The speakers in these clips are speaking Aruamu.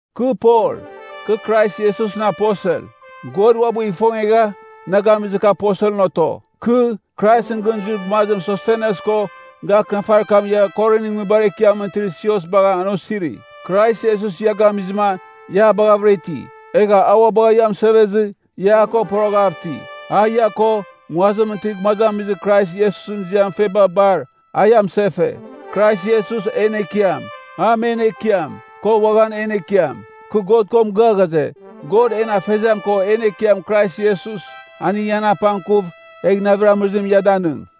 Kɨ Pol, kɨ Krais Iesusɨn aposel. God uabɨ ifongegha, na gamizɨ kɨ aposelɨn oto. Kɨ, Kraisɨn gɨn zuir gumazim Sostenes ko, ga akɨnafarir kam ia Korinɨn nguibar ekiamɨn itir sios bagha an osiri. Krais Iesus ia gamizɨma, ia a baghavɨra iti. Egha a ua bagha ia amɨsevezɨ, ia a ko poroghav iti. A ia ko, nguazimɨn itir gumazamizir Krais Iesusɨn ziamɨn feba bar, a ia mɨsefe. Krais Iesus, en Ekiam. A men Ekiam, ko uaghan en Ekiam. Kɨ God ko mɨgɨa ghaze, God en Afeziam ko en Ekiam Krais Iesus, aning ian apangkuv, egh navir amɨrɨzim ia danɨng.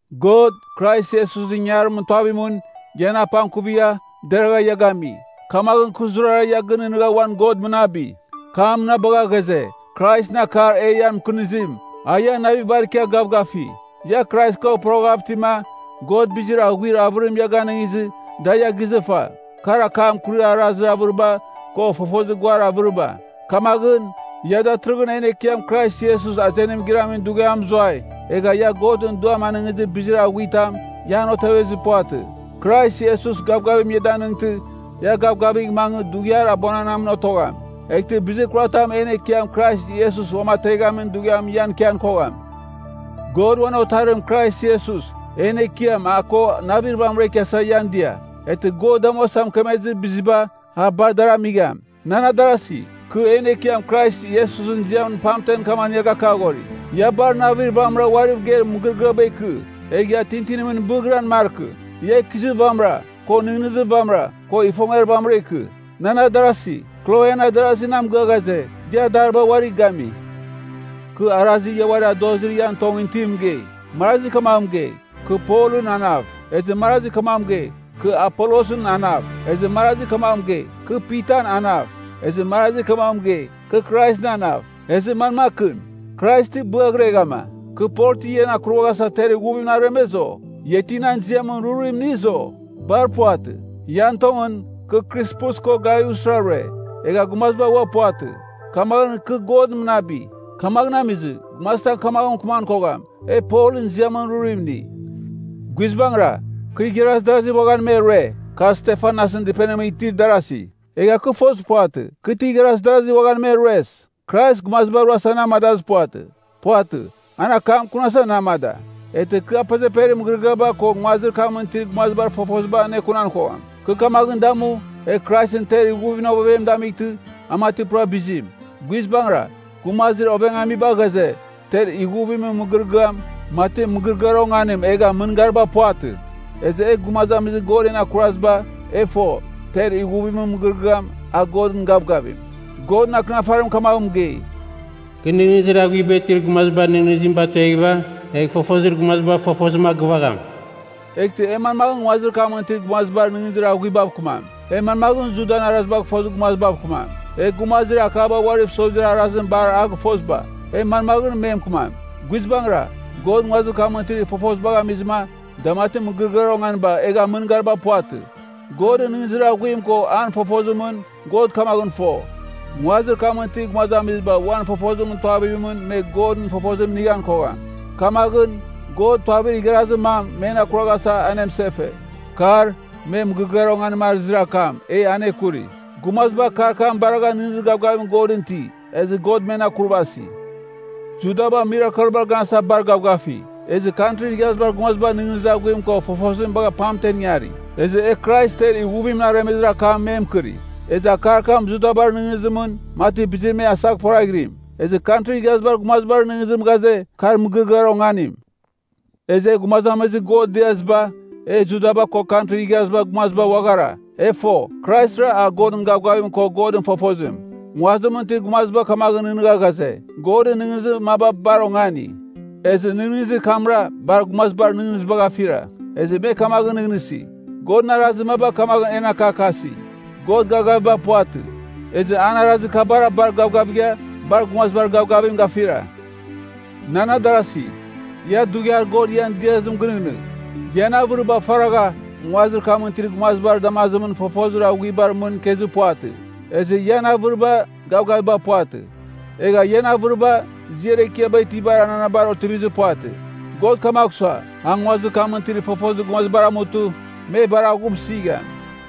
God, Krais Iesusɨn ingangarimɨn tuavimɨn, ian apangkuvigha, deragha ia gami. Kamaghɨn kɨ zurara ia gɨnɨghnɨgha uan God mɨnabi. Kɨ a mɨnabagha ghaze, Kraisɨn akar e ian mɨkɨnizim, a ian navibar ikia gavgafi. Ia Krais ko poroghav itima, God bizir aghiur avɨrim ia ganɨngizɨ, da ia gizɨfa, kar akam akurir arazir avɨriba, ko fofozir guar avɨriba. Kamaghɨn, ia datɨrɨghɨn en Ekiam Krais Iesus azenim giramin dughiam mɨzuai, egha ia Godɨn Duam anɨngizir bizir aghuitam, ia an otevizir puvatɨ. Krais Iesus gavgavim ia danɨngtɨ, ia gavgavigh mangɨ, dughiar abuananamɨn otogham, eghtɨ bizir kuratam en Ekiam Krais Iesus Uamateghamin Dughiamɨn ian ikian kogham. God uan Otarim Krais Iesus, en Ekiam a ko navir vamɨra ikiasa ian dia. Eghtɨ God damuasa mɨkemezɨ biziba, a bar adar amigham. Nan adarasi, kɨ en Ekiam Krais Iesusɨn ziamɨn pamtem kamaghɨn ia gakaghori, ia bar navir vamɨra uariv geir mɨgɨrɨgɨaba ikɨ. Egh ia tintinimɨn bɨghiran markɨ. Ia ikɨzir vamɨra, ko nɨghnɨzir vamɨra, ko ifongiar vamɨra ikɨ. Nan adarasi, Kloen adarazi na mɨgɨa ghaze, ia adariba uari gami. Kɨ arazir ia uari adozibar ian tongɨn itim mɨgei. Marazi kamaghɨn mɨgei, “Kɨ Polɨn anav.” Ezɨ marazi kamaghɨn mɨgei, “Kɨ Apolosɨn anav.” Ezɨ marazi kamaghɨn mɨgei, “Kɨ Pitan anav.” Ezɨ marazi kamaghɨn mɨgei, “Kɨ Kraisɨn anav.” Ezɨ manmakɨn? Krais ti bɨaghireghama? Kɨ Pol ti ian akurvaghasa ter ighuvimɨn aremez, o? Ia ti nan ziamɨn rurim iniz, o? Bar puvatɨ! Ian tongɨn, kɨ Krispus ko Gaiusra rue, egha gumaziba ua puvatɨ. Kamaghɨn kɨ God mɨnabi. Kamaghɨn amizɨ, gumazitam kamaghɨn mɨkɨman kogham, “E Polɨn ziamɨn rurim ini.” (Guizbangɨra, kɨ igharaz darazi uaghan me rue, kar Stefanasɨn dɨpenimɨn itir adarazi. Egha kɨ fozir puvatɨ, kɨ ti igharaz darazi uaghan me rues.) Krais gumaziba ruasa na amadazir puvatɨ. Puvatɨ. An akam akunasa na amada. Eghtɨ kɨ apezeperir mɨgɨrɨgɨaba ko nguazir kamɨn itir gumazibar fofozim anekunan kogham. Kɨ kamaghɨn damu, egh Kraisɨn ter ighuvimɨn ovevem damightɨ, a mati pura bizim. Guizbangɨra, gumazir ovengamiba ghaze, ter ighuvimɨn mɨgɨrɨgɨam, mati mɨgɨrɨgɨar onganim egha mɨngariba puvatɨ. Ezɨ e gumazamizir God en akurvaziba, e fo, ter ighuvimɨn mɨgɨrɨgɨam, a Godɨn gavgavim. Godɨn Akɨnafarim kamaghɨn mɨgei, “Kɨ nɨghnɨzir aghuiba itir gumazibar nɨghnɨzim batueghɨva, egh fofozir gumazibar fofozim agɨvagham.” Eghtɨ e manmaghɨn nguazir kamɨn itir gumazibar nɨghnɨzir aghuibav kɨmam? E manmaghɨn Judan Arazibagh fozir gumazibav kɨmam? E gumazir akaba uariv sozir arazim bar a gɨfoziba, e manmaghɨn me mɨkɨmam? Guizbangɨra, God nguazir kamɨn itir fofozibagh amizɨma, da mati mɨgɨrɨgɨar onganiba egha mɨngariba puvatɨ. Godɨn nɨghnɨzir aghuim ko an fofozimɨn, God kamaghɨn fo, nguazir kamɨn itir gumazamiziba uan fofozimɨn tuavimɨn me Godɨn fofozim inighan kogham. Kamaghɨn, God tuavir igharazir mam men akuraghasa anemɨsefe. Kar, me “mɨgɨrɨgɨar onganim” arɨzir akam, e aneakuri. Gumaziba akar kam baragha nɨghnɨzir gavgavim Godɨn iti, ezɨ God men akurvasi. Judaba mirakelbar ganasa bar gavgafi, ezɨ Kantrin Igharazibar Gumaziba nɨghnɨzir aghuim ko fofozim bagha pamtemɨn ingari. Ezɨ e Krais ter ighuvimɨn aremezir akam me mɨkɨri. Ezɨ akar kam Judabar nɨghnɨzimɨn, mati bizir me asaghporaghɨrim. Ezɨ Kantrin Igharazibar Gumazibar nɨghnɨzim ghaze, kar mɨgɨrɨgɨar onganim. Ezɨ e gumazamizir God diaziba, e Juda ko Kantrin Igharazibar Gumaziba uaghara, e fo, Kraisra a Godɨn gavgavim ko Godɨn fofozim. Nguazimɨn itir gumaziba kamaghɨn nɨghnɨgha ghaze, “Godɨn nɨghnɨzir maba bar ongani.” Ezɨ nɨghnɨzir kamra bar gumazibar nɨghnɨzibagh afira. Ezɨ me kamaghɨn nɨghnɨsi, Godɨn arazir maba kamaghɨn en akakasi, God gavgaviba puvatɨ. Ezɨ an arazir kabara bar gavgavigha, bar gumazibar gavgavim gafira. Nan adarasi, ia dughiar God ian diazim gɨnɨghnɨgh. Ian avɨriba faragha, nguazir kamɨn itir gumazibar damazimɨn, fofozir gumazibar mɨn ikezir puvatɨ. Ezɨ ian avɨriba, gavgaviba puvatɨ. Egha ian avɨriba, ziar ekiaba itibar ananabar otivizir puvatɨ. God kamagh sua, a nguazir kamɨn itir fofozir gumazibar amutɨ, me bar aghumsɨgham.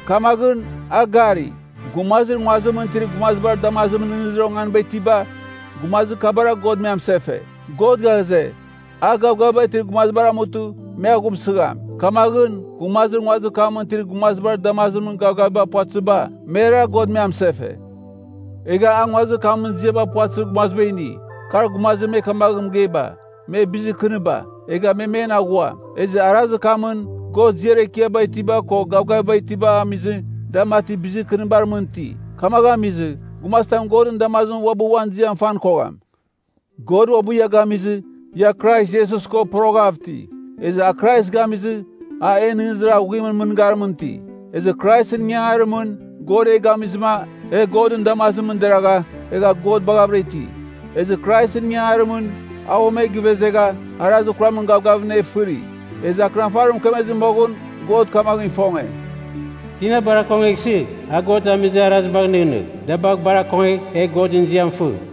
Kamaghɨn, a gari, gumazir nguazimɨn itir gumazibar damazimɨn nɨghnɨzir onganiba itiba, gumazir kabara God me amɨsefe. God ghaze, a gavgaviba itir gumazibar amutɨ, me aghumsɨgham. Kamaghɨn, gumazir nguazir kamɨn itir gumazibar damazimɨn gavgaviba puvatɨziba, merara God me amɨsefe. Egha a nguazir kamɨn ziaba puvatɨzir gumaziba ini, kar gumazir me kamaghɨn mɨgeiba, me bizir kɨniba, egha me men aghua. Ezɨ arazir kamɨn, God ziar ekiaba itiba ko gavgaviba itibagh amizɨ, da mati bizir kɨnibar mɨn iti. Kamaghɨn amizɨ, gumazitam Godɨn damazimɨn uabɨ uan ziam fan kogham. God uabɨ ia gamizɨ, ia Krais Iesus ko poroghav iti. Ezɨ a Krais gamizɨ, a en nɨghnɨzir aghuimɨn mɨngarimɨn iti. Ezɨ Kraisɨn ingangarimɨn, God e gamizɨma, e Godɨn damazimɨn deragha, egha God baghavɨra iti. Ezɨ Kraisɨn ingangarimɨn, a uam e givezegha, arazir kuramɨn gavgavimɨn e fɨri. Ezɨ Akɨnafarim mɨkemezɨ moghɨn God kamaghɨn ifonge, “Tina bar akongeghsɨ, a God amizir arazibagh nɨghnɨgh, da bagh bar akongegh, egh Godɨn ziam fɨ.”